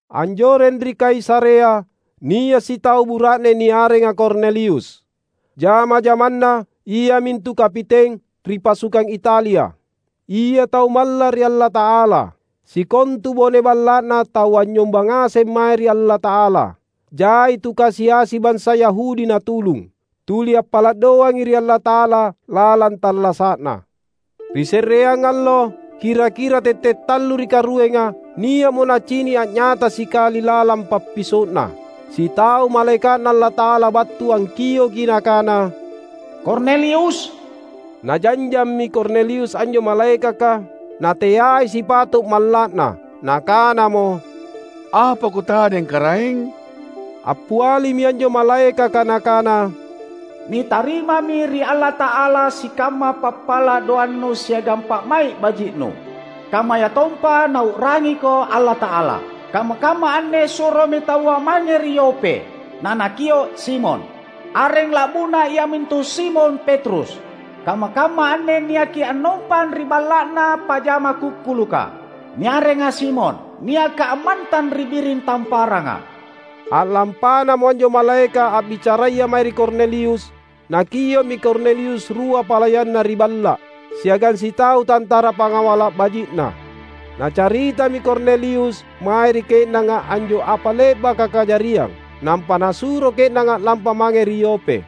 Anjoreng ri Kaisarea, nia’ sitau bura’ne niarenga Kornelius. Jama-jamanna, iamintu kapiteng ri "Pasukang Italia". Ia tau malla’ ri Allata’ala. Sikontu bone balla’na tau anynyomba ngaseng mae ri Allata’ala. Jai tu kasi-asi bansa Yahudi natulung. Tuli appala’ doangi ri Allata’ala lalang tallasa’na. Ri se’reang allo, kira-kira tette’ tallu ri karuenga, nia’mo nacini’ a’nyata sikali lalang pappiso’na, sitau malaeka’Na Allata’ala battu angkioki nakana, "Kornelius!" Najanjammi Kornelius anjo malaekaka, nateai sipato’ malla’na. Nakanamo, "Apa kutadeng Karaeng?" Appialimi anjo malaekaka nakana, "Nitarimami ri Allata’ala sikamma pappala’ doannu siagang pa’mai’ baji’nu, kammayatompa Nau’rangiko Allata’ala. Kamma-kamma anne suromi taua mange ri Yope, nanakio’ Simon. Areng la’buna iamintu Simon Petrus. Kamma-kamma anne niaki annompang ri balla’na pajama kukkuluka, niarenga Simon, niaka ammantang ri biring tamparanga." A’lampanamo anjo malaeka’ a’bicaraya mae ri Kornelius, nakio’mi Kornelius rua palayanna ri balla’, siagang sitau tantara pangawala’ baji’na. Nacaritami Kornelius mae ri ke’nanga anjo apa le’baka kajariang, nampa nasuro ke’nanga a’lampa mange ri Yope.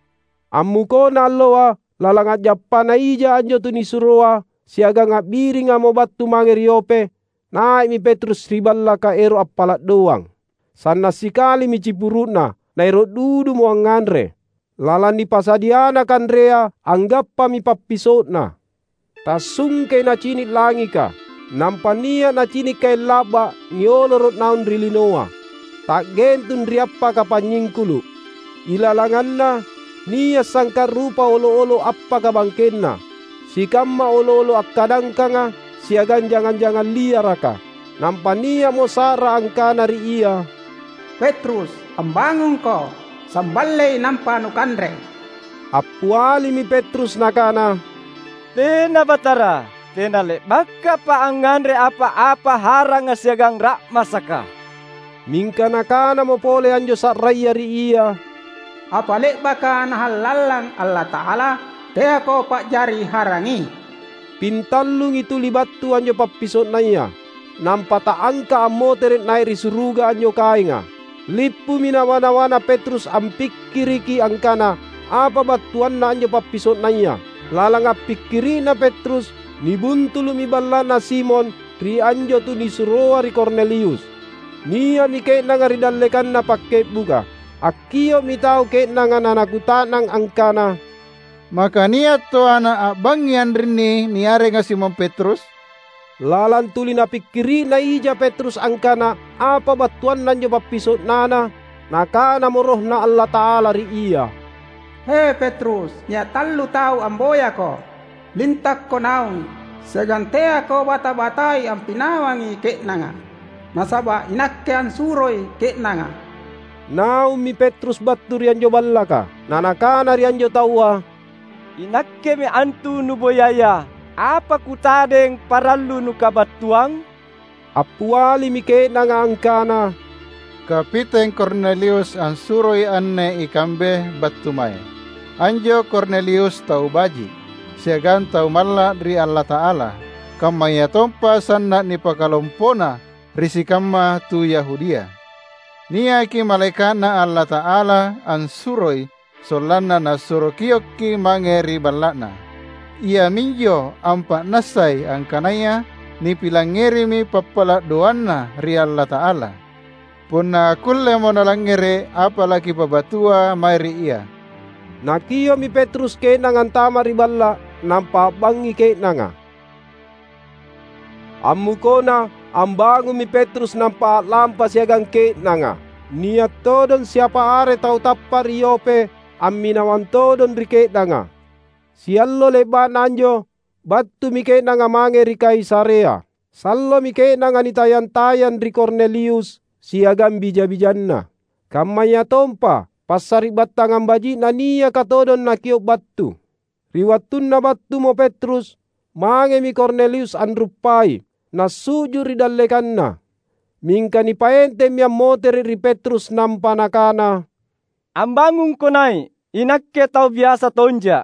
Ammukona alloa, lalang a’jappana ija anjo tunisuroa siagang a’biringamo battu mange ri Yope, nai’mi Petrus ri ballaka ero’ appala’ doang. Sanna’ sikalimi cipuru’na, naero’ dudumo angnganre. Lalang nipasadiana kanrea anggappami pappiso’na. Tassungkei nacini’ langika, nampa nia’ nacini’ kaeng la’ba’ nioloro’ naung ri linoa, ta’gentung ri appaka panynyingkulu’. Ilalanganna, nia’ sangka’ rupa olo’-olo’ appaka bangkenna, sikamma olo’-olo’ akkadangkanga, siagang jangang-jangang liaraka. Nampa nia’mo sa’ra angkana ri ia, "Petrus, ambangungko! Samballei, nampa nukanre!" Appialimi Petrus nakana, "Tena, Batara! Tena le’bakapa’ angnganre apa-apa haranga siagang ra’masaka." Mingka nakanamo pole anjo sa’raya ri ia, "Apa le’baka Nahallallang Allata’ala, teako pa’jari harangi." Pintallungi tuli battu anjo pappiso’naya, nampa ta’angka’ ammotere’ nai’ ri suruga anjo kaenga. Lippumi nawa-nawana Petrus ampikkiriki angkana apa battuanna anjo pappiso’naya. Lalang appikkiri’na Petrus, nibuntulu’mi balla’na Simon ri anjo tunisuroa ri Kornelius. Nia’mi ke’nanga ri dallekanna pakke’buka. Akkio’mi tau ke’nanga nanakuta’nang angkana, "Maka nia’ toana a’bangngi anrinni niarenga Simon Petrus?" Lalang tuli napikiri’na ija Petrus angkana apa battuanna anjo pappiso’nana, Nakanamo RohNa Allata’ala ri ia, "He, Petrus, nia’ tau tallu amboyako. Lintakko naung, siagang teako bata-batai ampinawangi ke’nanga, nasaba’ iNakke assuroi ke’nanga." Naummi Petrus battu ri anjo ballaka, na nakana ri anjo taua, "Inakkemi antu nuboyaya. Apa kutadeng parallu nukabattuang?" Appialimi ke’nanga angkana, "Kapiteng Kornelius ansuroi anne ikambe battu mae. Anjo Kornelius tau baji’, siagang tau malla’ ri Allata’ala, kammayatompa sanna’ nipakalompona ri sikamma tu Yahudia. Niaki malaeka’Na Allata’ala ansuroi sollanna nasuro kiokki’ mange ri balla’na. Iaminjo ampa’nassai angkanaya nipilangngerimi pappala’ doanna ri Allata’ala, punna akkullemo nalangngere’ apa lakipabattua mae ri ia." Nakio’mi Petrus ke’nanga antama’ ri balla’, nampa a’bangngi ke’nanga. Ammukona, ambangummi Petrus nampa a’lampa siagang ke’nanga. Nia’ todong siapa are tau tappa’ ri Yope amminawang todong ri ke’nanga. Siallo le’ba’na anjo, battumi ke’nanga mange ri Kaisarea. Sallomi ke’nanga nitayang-tayang ri Kornelius siagang bija-bijanna, kammayatompa passari’battangang baji’na niaka todong nakio’ battu. Ri wattunna battumo Petrus, mangemi Kornelius anruppai, nasu’ju’ ri dallekanna. Mingka nipaentemmi ammotere’ ri Petrus nampa nakana, "Ambangungko nai’! Inakke tau biasa tonja’."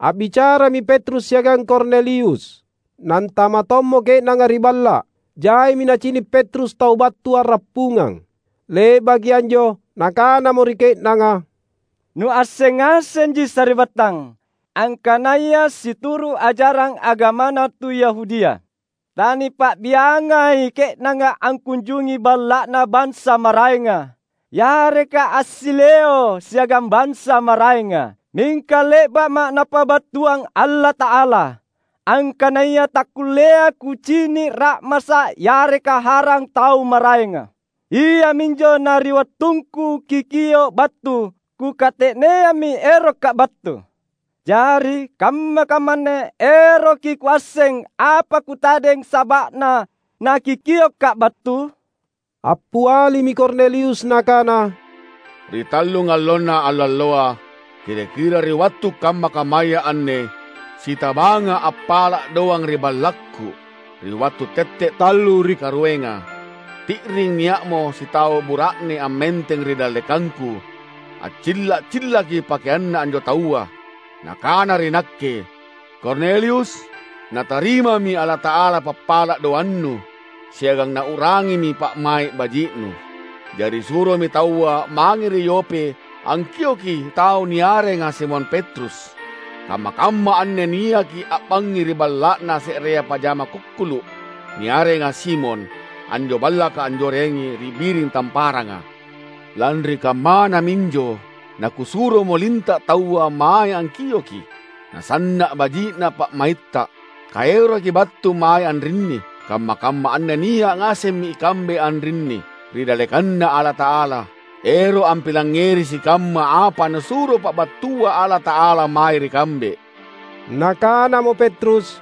A’bicarami Petrus siagang Kornelius, nantama’ tommo ke’nanga ri balla’. Jaimi nacini’ Petrus tau battu a’rappungang. Le’baki anjo nakanamo ri ke’nanga, "Nuasseng ngasenji sari’battang, angkanaya situru’ ajarang agamana tu Yahudia, tanipa’biangai ke’nanga angkunjungi balla’na bansa maraenga, yareka assileo’ siagang bansa maraenga. Mingka le’ba’ma’ Napabattuang Allata’ala, angkanaya takkulleai kucini’ ra’masa’ yareka harang tau maraenga. Iaminjo, na ri wattungku kikio’ battu, kukate’neammi eroka battu. Jari kamma-kamma anne eroki kuasseng, apa kutadeng saba’na nakikioka’ battu?" Appialimi Kornelius nakana, "Ri tallungallona allaloa, kira-kira ri wattu kamma-kammaya anne, sitabanga’ appala’ doang ri ballakku, ri wattu tette’ tallu ri karuenga. Ti’ring nia’mo sitau bura’ne ammenteng ri dallekangku. Accilla’-cillaki pakeanna anjo taua. Nakana ri nakke, ‘Kornelius! Natarimami Allata’ala pappala’ doannu, siagang Nau’rangimi pa’mai’ baji’nu. Jari suromi taua mange ri Yope angkioki tau niarenga Simon Petrus. Kamma-kamma anne niaki a’bangngi ri balla’na se’rea pajama kukkulu’, niarenga Simon; anjo ballaka anjorengi ri biring tamparanga.’ Lanri kammana minjo nakusuromo linta’ taua mae angkiokki’. Nasanna’ baji’na pa’maitta, kaerokki’ battu mae anrinni. Kamma-kamma anne nia’ ngasemmi ikambe anrinni, ri dallekanNa Allata’ala, ero’ ampilangngeri sikamma apa Nasuro pabattua Allata’ala mae ri kambe." Nakanamo Petrus,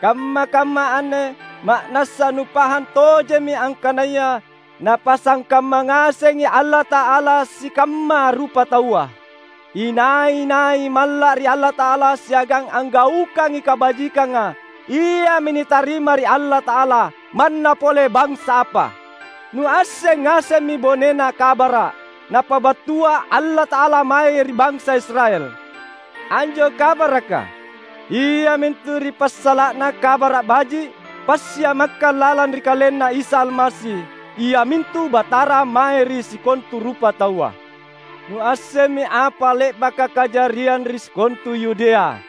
"Kamma-kamma anne ma’nassa nupahang tojemmi angkanaya Napasangkamma ngasengi Allata’ala sikamma rupataua. Inai-nai malla’ ri Allata’ala siagang anggaukangi kabajikanga, iami nitarima ri Allata’ala, manna pole bansa apa. Nuasseng ngasemmi bonena kabara’ Napabattua Allata’ala mae ri bansa Israel. Anjo kabaraka, iamintu ri passala’na Kabara’ Baji’ passiamakkang lalang ri KalenNa Isa Almasi iamintu Batara mae ri sikontu rupataua. Nuassemmi apa le’baka kajariang ri sikontu Yudea,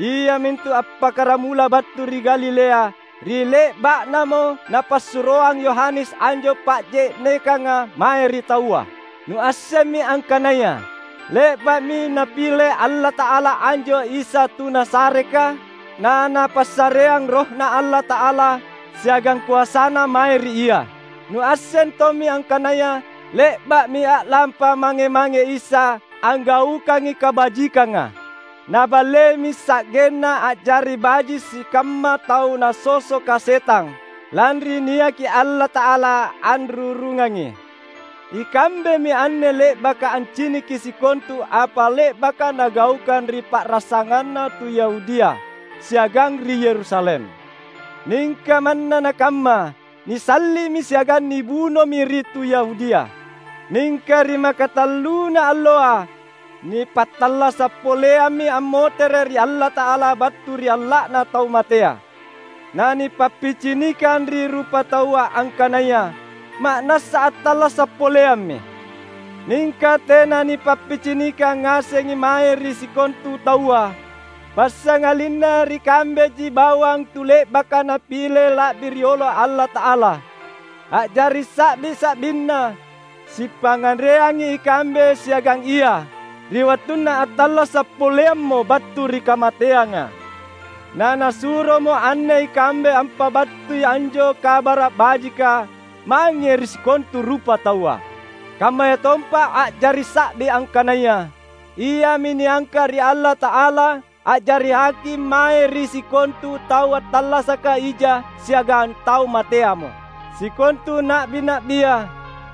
iamintu appakkaramula battu ri Galilea ri le’ba’namo napassuroang Yohanes anjo pa’je’nekanga mae ri taua. Nuassemmi angkanaya le’ba’mi Napile Allata’ala anjo Isa tu Nazaretka, naNapassareang RohNa Allata’ala siagang koasaNa mae ri Ia. Nuasseng tommi angkanaya le’ba’mi a’lampa mange-mange Isa anggaukangi kabajikanga; Naballeimi sa’genna a’jari baji’ sikamma tau nasosoka setang, lanri niaki Allata’ala anrurungangi. Ikambemi anne le’baka anciniki sikontu apa le’baka Nagaukang ri pa’rasanganna tu Yahudia siagang ri Yerusalem. Mingka manna nakamma, nisalli’mi siagang nibunomi ri tu Yahudia. Mingka ri makatalluna alloa, nipattallasa’ poleammi ammotere’ ri Allata’ala battu ri alla’na tau matea, nanipappicinikang ri rupataua angkanaya ma’nassa attallasa’ poleammi. Mingka tena nipappicinikang ngasengi mae ri sikontu taua, passangalinna ri kambeji bawang tu le’baka Napile la’bi riolo Allata’ala a’jari sa’bi-sa’binNa: Sipangnganreangi ikambe siagang Ia ri wattunna attallasa’ poleammo battu ri kamateanga. Na Nasuromo anne ikambe ampabattui anjo Kabara’ Bajika mange ri sikontu rupataua. Kammayatompa a’jari sa’bi angkanaya Iami niangka’ ri Allata’ala a’jari Haking mae ri sikontu tau attallasaka ija siagang tau mateamo. Sikontu na’bi-na’bia,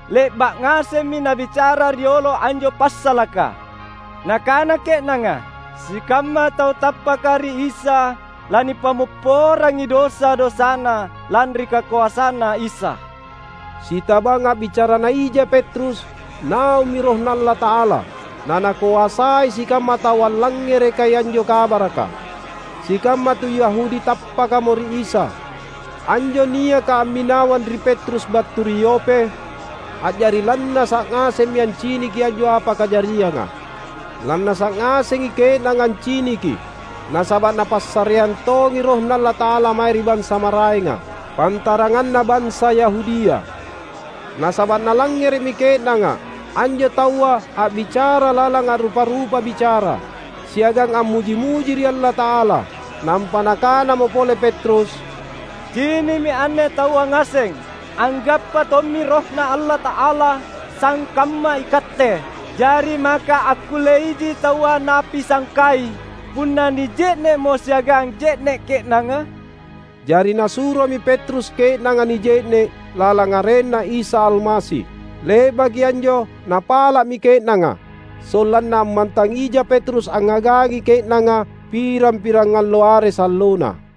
le’ba’ ngasemmi nabicara riolo anjo passalaka. Nakana ke’nanga, sikamma tau tappaka ri Isa lanipammopporangi dosa-dosana, lanri kakoasanNa Isa." Sitabang a’bicarana ija Petrus, naummi RohNa Allata’ala, nanakoasai sikamma tau allangngerekai anjo kabaraka. Sikamma tu Yahudi tappakamo ri Isa, anjo niaka amminawang ri Petrus battu ri Yope, a’jari lannasa’ ngasemmi anciniki anjo apa kajarianga. Lannasa’ ngasengi ke’nanga anciniki nasaba’ Napassareang tongi RohNa Allata’ala mae ri bansa maraenga, pantaranganna bansa Yahudia. Nasaba’ nalangngere’mi ke’nanga anjo taua a’bicara lalang a’rupa-rupa bicara, siagang ammuji-muji ri Allata’ala. Nampa nakanamo pole Petrus, "Cini’mi anne taua ngaseng, anggappa tommi RohNa Allata’ala, sangkamma ikatte. Jari maka akkulleiji taua napisangkai punna nije’ne’mo siagang je’ne’ ke’nanga?" Jari nasuromi Petrus ke’nanga nije’ne’ lalang arenNa Isa Almasi. Le’baki anjo napala’mi ke’nanga, sollanna ammantang ija Petrus angngagangi ke’nanga pirang-pirangallo are sallona.